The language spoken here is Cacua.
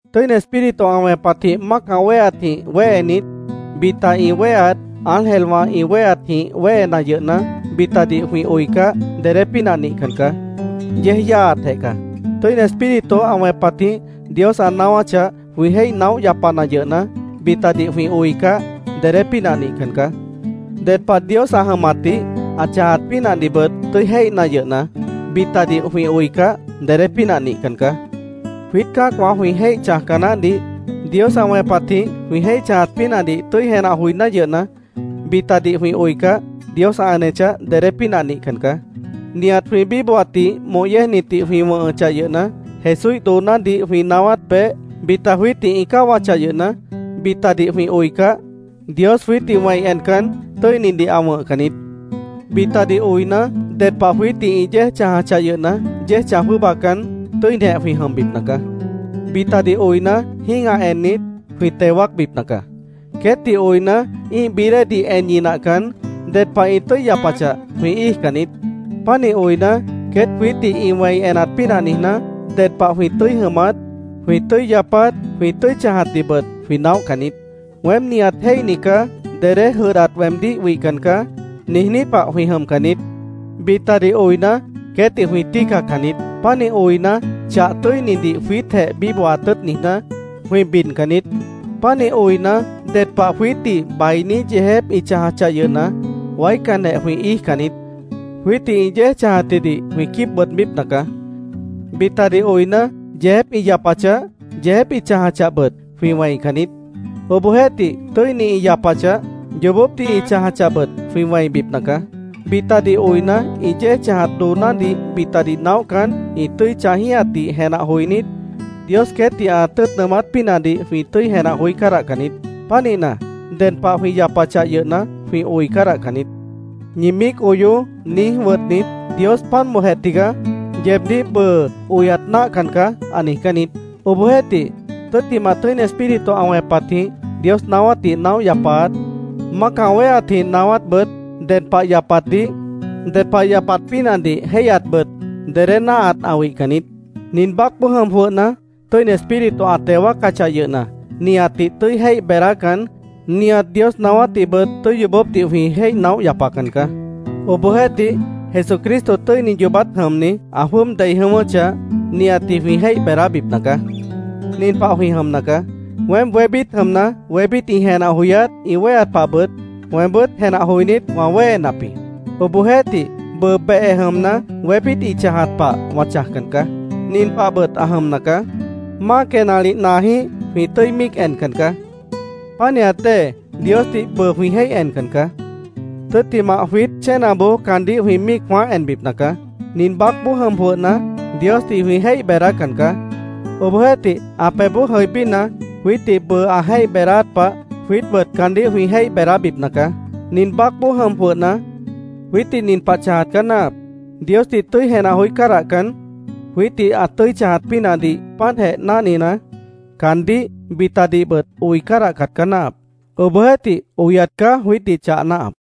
Tʉ́ini Espíritu ã wẽpatjĩh mácah wéheatjĩh wéhenit, bita ĩ wéheat, ángelwã ĩ wéheatjĩh wéhena yʉhna, bitadih jwĩ oicah, dedé pínah nihcan caá. Yéej yáaatjeh caá. Tʉ́ini Espíritu ã wẽpatjĩh Dios ã naáwáchah, jwĩ jéih naóh yapana yʉhna, bitadih jwĩ oicah, dedé pínah nihcan caá. Ded pah Dios ã jʉmatdih, ã chãjat pínahdihbʉt tʉ́i jéihna yʉhna, bitadih jwĩ oicah, dedé pínah nihcan caá. Jwiít cã́acwã jwĩ jéih chãjca naáhdih Dios ã wẽpatjĩh jwĩ jéih chãjat pínahdih tʉ́i jenah joiná yʉhna, bitadih jwĩ oicah, Dios ã enechah, dedé pínah nihcan caá. Nihat jwĩ bíbohatdih moh yéejnitdih jwĩ wʉ̃hʉchah yʉhna, Jesúíh doonádih jwĩ naáwát peéh bita jwiítdih ĩ cáwachah yʉhna, bitadih jwĩ oicah, Dios jwiítdih wẽi encan, tʉ́inidih ã wʉ̃hcan niít. Bitadih oina, ded pah jwiítdih ĩ yéej chãjachah yʉhna, yéej chãj jwʉ́ʉbacan, tʉ́inijeh jwĩ jʉmbipna caá. Bitadih oina, jĩ́gah ennit, jwĩ teo wáacbipna caá. Queétdih oina, ĩ́ih bií déedih en ñinahcan, ded pah ĩ tʉ́i yapachah, jwĩ íijcan niít. Pánih oina, queét jwiítdih ĩ wẽi enat pínah niijná, ded pah jwĩ tʉ́i jʉmat, jwĩ tʉ́i yapat, jwĩ tʉ́i chãjatdihbʉt jwĩ naóhcan niít. “Weém nihat jéihni caá. Dedé jʉdhdat weemdíh wihcan caá”, niijní pah jwĩ jʉmcan niít. Bitadih oina, queétdih jwĩ tíicacan niít. Pánih oina, chah tʉ́inidih jwiítjeh bíbohat tʉ́ʉt niijná, jwĩ bidcan niít. Pánih oina, ded pah jwiítdih bainí yeejép ĩ chãjachah yʉhna, waícanjeh jwĩ íijcan niít. Jwiítdih ĩ yéej chãjatjidih jwĩ quíib bʉʉdbípna caá. Bitadih oina, yeejép ĩ yapachah, yeejép ĩ chãjachahbʉt, jwĩ wẽican niít. Obohjeéhtih, tʉ́ini ĩ yapachah, yoobópdih ĩ chãjachahbʉt, jwĩ wẽibipna caá. Bitadih oina, ĩ yéej chãjat doonádih bitadih naóhcan, ĩ tʉ́i chãjíhatdih jenah joinít, Dios queétdih ã tʉ́ʉt nʉʉmát pínahdih jwĩ tʉ́i jenah joí cádahcan niít. Pánihna, ded pah jwĩ yapachah yʉhna, jwĩ oi cádahcan niít. “Ñi míic oyoó”, niíj wʉtnit, Dios “Páant bóojeh tigaá. Yeebdíh bʉʉ oyat náahcan caá”, ã niijcán niít. Obohjeéhtih tʉ́ttimah, Tʉ́ini Espíritu ã wẽpatjĩh Dios naáwátdih naóh yapaat, mácah wéheatjĩh naáwátbʉt, ded pah yapatdih, ded pah yapat pínahdih jéihyatbʉt dedé náahat ã wihcan niít. Nin baácboó jʉm jwʉhna, Tʉ́ini Espíritu ã teo wáacachah yʉhna, nihatdih tʉ́i jéih beedácan, nihat Dios naáwátdihbʉt tʉ́i yoobópdih jwĩ jéih naóh yapacan caá. Obohjeéhtih, Jesucristo, tʉ́ini yoobát jʉmni, ã jwʉ́ʉb dei jʉ̃ʉ́wʉ́chah, nihatdih jwĩ jéih beedábipna caá. Nin pah jwĩ jʉmna caá: Weém wébít jʉmna, wébít ĩ jenah joyát, ĩ wéheat pahbʉt, weembʉ́t jenah joinít, wã wéhenap jĩ. Obohjeéhtih, bʉʉ behe jʉmna, wébít ĩ chãjat pah wã chãjcan caá. Nin pahbʉt ã jʉmna caá: Máa quenalih naajĩ́h jwĩ tʉ́i míic encan caá. Pánihat dée Diosdih bʉʉ jwĩ jéih encan caá. Tʉ́ttimah, jwiít chénaboó caandíh jwĩ míic jwãáh enbipna caá. Nin baácboó jʉm jwʉhna, Diosdih jwĩ jéih beedácan caá. Obohjeéhtih, ã pebhboó jʉibína, jwiítdih bʉʉ ã jéih beedáát pah, jwiítbʉt caandíh jwĩ jéih beedábipna caá. Nin baácboó jʉm jwʉhna, jwiítdih nin pah chãjat caá náahap: Diosdih tʉ́i jenah joí cádahcan, jwiítdih ã tʉ́i chãjat pínahdih páantjeh náhnina, caandíh, bitadihbʉt oi cádahcat caá náahap. Obohjeéhtih, oyat caá jwiítdih chah náahap.